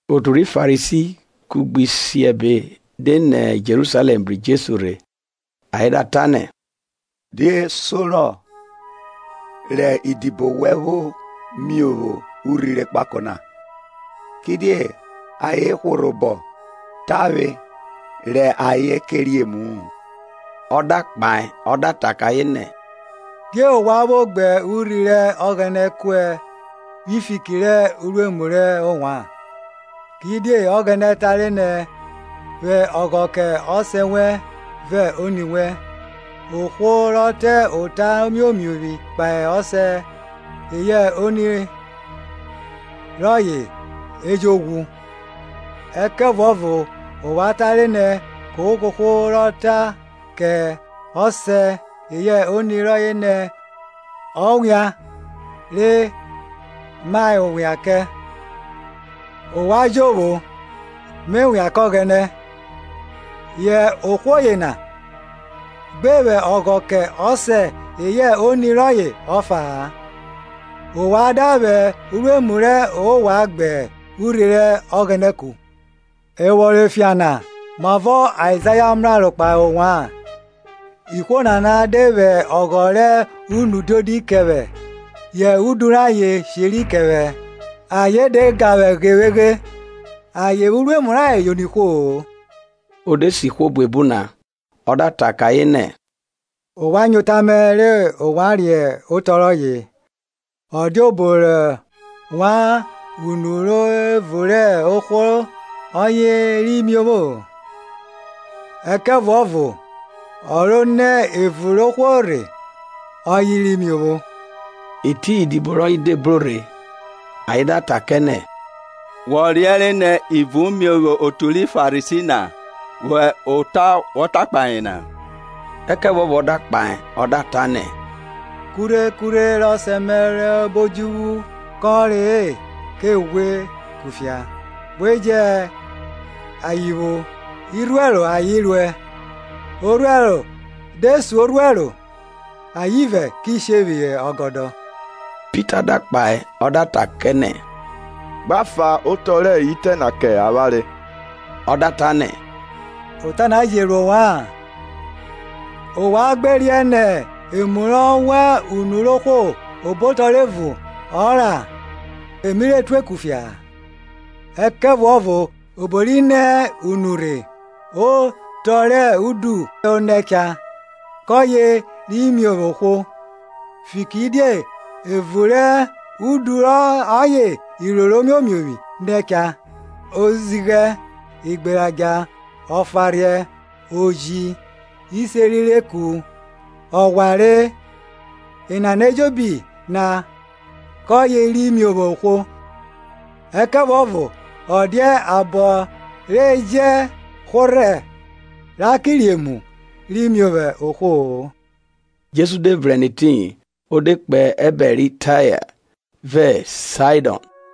Otu ri Farisi kugbe isiẹbe de nẹ Jerusalẹm bru Jesu rhe, ayen da ta kẹ nẹ, Die sorọ rẹ idibo wẹ vwo miovwo urhi rẹ ekpako na? kidie ayen hworhẹ obọ tavwe rẹ ayen ke re emu-u. Ọ da kpahe ọ da ta kẹ ayen nẹ, Die ovwan vwo gbe urhi rẹ Ọghẹnẹ kuẹ vwi fiki rẹ uruemu rẹ ovwan? Kidie Ọghẹnẹ tare nẹ, Vwẹ ọghọ kẹ ọsẹ wẹn vẹ oni wẹn. Ohwo ro ta ota omiomiovwi kpahe ọsẹ eyẹ oni rọye e jo ghwu. Ẹkẹvuọvo ovwan tare nẹ, Kohwo kohwo rọ ta kẹ ọsẹ eyẹ oni rọye nẹ, Erere rẹ ovwan a mrẹ vwẹ obọmẹ jovwo, me vwerọ kẹ Ọghẹnẹ. Yẹ ohwo yena gbe vwẹ ọghọ kẹ ọsẹ eyẹ oni rọye ọfa-a. Ovwan da vwẹ uruemu rẹ ovwan gbe urhi rẹ Ọghẹnẹ ku. Evwọnrọn efian na, mavọ Aizaya mraro kpahe ovwan. Ihwo nana de vwẹ ọghọ rẹ unu diodi kẹ vwẹ, Yẹ udu rayen sheri kẹ vwẹ. Ayen de ga vwẹ ghevweghe, Ayen me vwẹ uruemu rayen yono ihwo. O de se ihwo buebu na, o da ta kẹ ayen nẹ, Ovwan nyo ota mẹ re ovwan riẹn ọto rọye. Ọ dia obo rọ wan unu ro evun rẹ ohwo ọye ri miovwo-o, ẹkẹvuọvo ọ ro nẹ evun rẹ ohwo rhe ọye ri miovwo. Etiyin idibo rọye de bro rhe, ayen da ta kẹ nẹ, Wọ riẹnre nẹ ivun miovwo otu ri Farisi na, vwẹ ota wọ ta kpahe ayen na? Ẹkẹvuọvo ọ da kpahe ọ da ta nẹ, Kurhe kurhe rẹ Ọsẹ mẹ rọ hẹ obo odjuvwu kọnre-e, ke ghwie kufia. We jẹ ayen vwo; irhuẹro ayen ruẹ. Orhuẹro de sun orhuẹro ayen ivẹ ki she phihọ ọgọdọ. Pita da kpahe ọ da ta kẹ nẹ, Gba fan otọ rẹ itẹ na kẹ avwanre. Ọ da ta nẹ, ota na je ro ovwa-an? Ovwan gbe riẹn nẹ, emu rọ wan unu ro ohwo obotọ rẹ evun ọ ra, e mi re tue kufia-a? Ẹkẹvuọvo obo ri nẹ unu rhe, otọ rẹ udu o nẹ cha; kọye ri miovwo ohwo. Fikiridie evu rẹ udu ọye iroro imiomiovwi nẹ cha; ozighẹ, igberadja, ọfanrhiẹ, ujiecho, iseri rẹ eku, ọghware. Enana ejobi na keye ri miovwo ohwo. Ẹkẹvuọvo ọ dia abọ re jẹ hworhẹ ra ke re emu ri miovwo ohwo-o. Jesu de vrẹn nẹ etiyin, o de kpo ẹbẹre ri Taya vẹ Saidọn.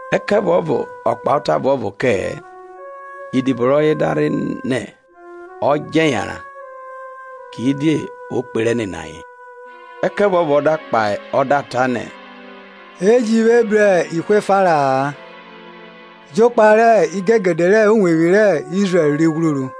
Ẹkẹvuọvo ọ kpahe ota ọvuọvo kẹ-ẹ. Idibo rọye da rhe nẹ ọ djẹ yanran, kidie o kperẹ nene ayen, Ẹkẹvuọvo ọ da kpahe ọ da ta nẹ, E ji vwe bru ihwo efa ra-a, jokpa rẹ igegede rẹ uwevwi rẹ Izrẹl ri ghwruru.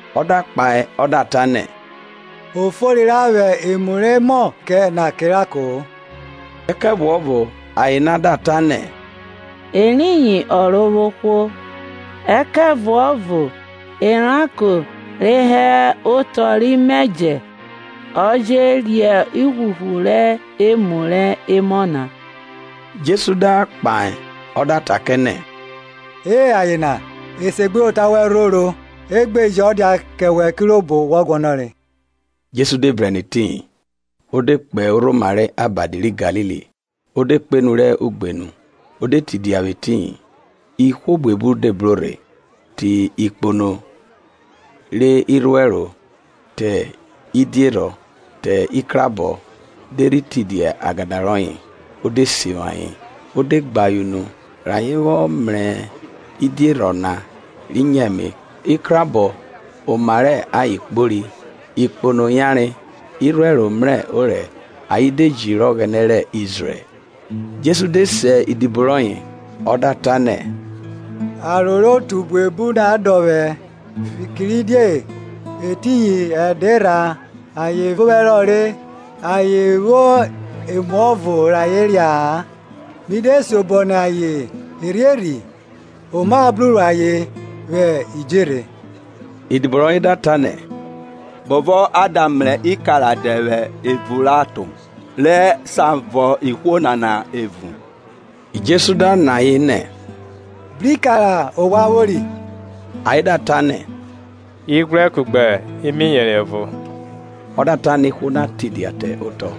Ọ da kpahe ọ da ta nẹ, O fori ra vwẹ emu rẹ emọ na kẹ eranko-o. Ẹkẹvuọvo, aye na da ta nẹ, eriyin Ọrovwohwo, ẹkẹvuọvo eranko re hẹ otọ rẹ imẹjẹ je re ivwuvwu rẹ emu ri she no rhe. Jesu da kpahe ọ da ta kẹ nẹ, E aye na, esegbuyota wẹn rhoro, gbe je ọ dia kẹ wẹ kirobo wọ guọnọre. Jesu de vrẹn nẹ etiyin, o de kpo orhoma rẹ abadi ri Galili o de kpo enu rẹ ugbenu, o de tidia vwẹ etiyin. Ihwo buebu de bro rhe, te ikpono, irhuẹro, idierhọn, ikrabọ, de rhi tidia agada rọye, o de sivwi ayen. Ọ de gbe ayen unu, rẹ ayen vwọ mrẹ idiẹrhọn na ri nyo ẹme, ikrahọ oma rẹ ayen kpori, ikpono yanre, irhuẹro mrẹ orẹ; ayen de jiri Ọghẹnẹ rẹ Izrẹl. Jesu de se idibo rọye, ọ da ta nẹ, aro rẹ otu buebu na dọ vwẹ, fikiridie etiyin ẹdẹ erha ayen vẹ ovwẹ herọ re, ayen vwo emuọvo rẹ ayen ria-a, mi de siobọ nẹ ayen erhierhi oma bruro ayen vwẹ idjerhe. Idibo rọye da ta nẹ, bovọ a da mrẹ ikara dẹ vwẹ evun rẹ aton, re sa vọn ihwo nana evun. Jesu da nọ ayen nẹ, bro ikara ovwan vwori? Ayen da ta nẹ ighwrẹ kugbe imiyeri evo. Ọ da ta nẹ ihwo na tidia te otọ.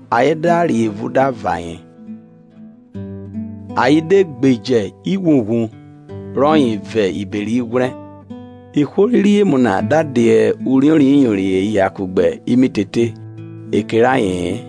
Ayen da re evun da vọn ayen; ayen de gbeje ivwuvwu rọye vọn ibere ighwrẹ. Ihwo re re emu na da dia uriori ẹne eya kugbe imitete e kere aye-en.